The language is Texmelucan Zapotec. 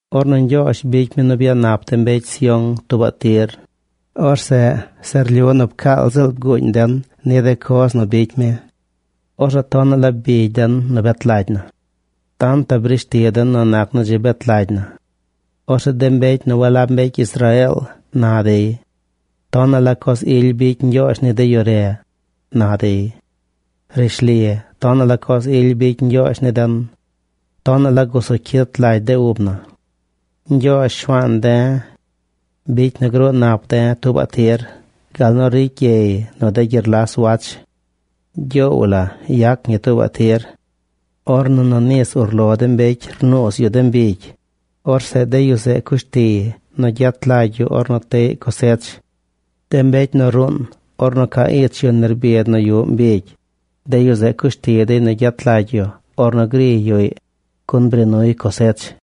Ornu Ñgyoozh bicy mi nu byanap de mbecy Sión tuubaꞌ tir, orzeꞌ se rlyu nu pcaal ziꞌl bguuñ den ni de coz nu bicy mi. Orzeꞌ tonaꞌ la bigy den nu bet lagy na. Tantaꞌ brishti den nu nac nu dzi bet lagy na. Orzeꞌ de mbecy nu walab mbecy Israeel na dey: “Tonaꞌ la coz ily bicy Ñgyoozh ni de yu re”, na dey. Rishli, tonaꞌ la coz ily bicy Ñgyoozh ni den. Tonaꞌ la gusu cyit lagy de ub na. Ñgyoozh, Shuaan de̱, bicy nu gruu nap de̱ tuubaꞌ tir gal nu ricy gyey nu de gyerlas wach. Gyoow la yac ñi tuubaꞌ tir. Ornu nu nis urlo de mbecy rnuuz yu de mbigy, orzeꞌ de yu zeꞌ cush tiy nu gyet lagy yu ornu teꞌy cosech. De mbecy nu ruun ornu ca ich yu nerbid nu yuꞌ mbigy, de yu zeꞌ cushti dey nu gyet lagy yu ornu griy yuꞌy, gun bri nuy cosech.